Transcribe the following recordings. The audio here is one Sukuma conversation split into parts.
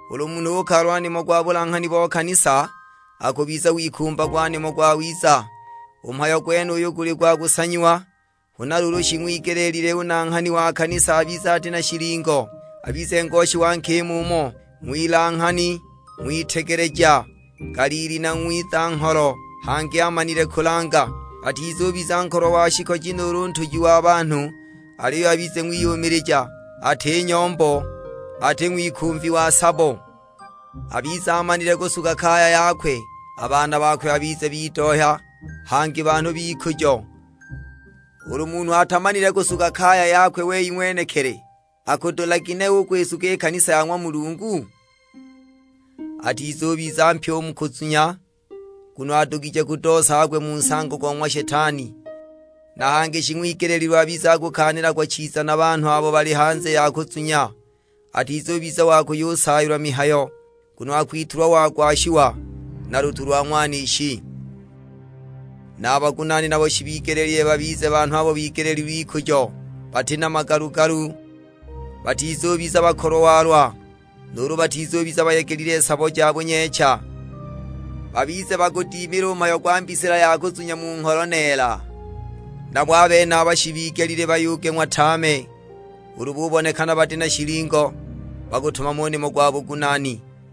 Ulu munhu ukalalwa nimo gwa bulanghani bo kanisa nuulu: buasikofu.', akubiza wikumbagwa nimo gwawiza; u mhayo gwenuyu guli gwa kusanyiwa. Huna luulu shing'wigelile u nanghani wa kanisa abize ati na shilingo, abize ngoshi wa nkima umo, ng'wilanghani, ng'witegeleja, ngaliili na ng'wiza-ngholo, hangi amanile kulanga. Atizubiza nkolwa wa shikoji nuulu ntuji wa banhu, aliyo abize ng'wiyumilija, ati nyombo, ati ng'wikumvi wa sabo. Abize amanile kusuga kaya yakwe, a baana bakwe babize bidohya, hangi banhu b'ikujo. (Ulu munhu atamanile kusuga kaya yakwe wei ng'wenekili, akudula ginehe u kwisuga i kanisa ya ng'wa Mulungu?) Atizubiza mpya u mu kuzunya, nguno adugije kudoosa agwe mu nsango go ng'wa Shetani. Na hangi shing'wigeleelilwe abize akukaanilagwa chiza na a banhu abo bali hanze ya kuzunya, atizubiza wa kuyusaayilwa mihayo, nguno akwitulwa wagwashiwa na lutu lwa ng'wanishi. Na a bagunaani nabo shibigelile babize banhu abo bigeleelilwe ikujo, bati na magalu-galu, batizubiza bakolwa-walwa, nuulu batizubiza bayegelile sabo ja bunyeecha. Babize bagudimile u mhayo gwa mbisila ya kuzunya mu ngholo neela. Nabo a benaba shibigelile bayugeng'wa tame; ulu bubonekana bati na shilingo, bagutumame u nimo gwa bugunaani.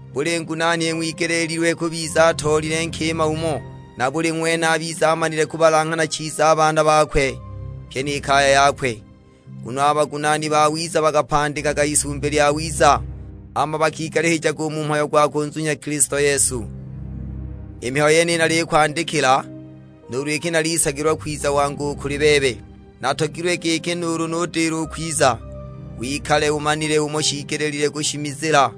Buli ngunaani ing'wigeleelilwe kubiza atoolile nkima umo, na buli ng'wene abize amanile kubalanghana chiza a baana bakwe, pyi ni kaya yakwe. Nguno a bagunaani bawiza bakapandikaga isumbi lyawiza, hama bakigalihijaga u mu mhayo gwa kunzunya Kilisto Yesu. I mihayo yeniyi nalikwandikila, nuulu iki nalisagilwa kwiza wangu u kuli bebe. Natogilwe giki nuulu nudila u kwiza, wikale umanile umo shiigelile kushimizila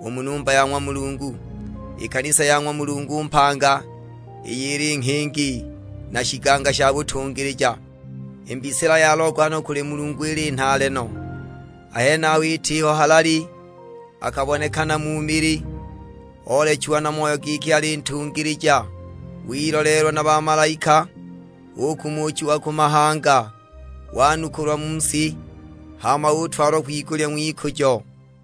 u mu numba ya ng'wa Mulungu, i kanisa ya ng'wa Mulungu mpanga, iyo ili nghingi na shiganga sha butungilija. I mbisila ya logohano kuli Mulungu ili nhaale no, a henaho itiho halali. Akabonekana mu mili, oolechiwa na Moyo giki ali ntungilija, wiloleelwa na bamalaika; ukumuchiwa ku mahanga, wanukulwa mu si, hama utwalwa kwigulya ng'wikujo.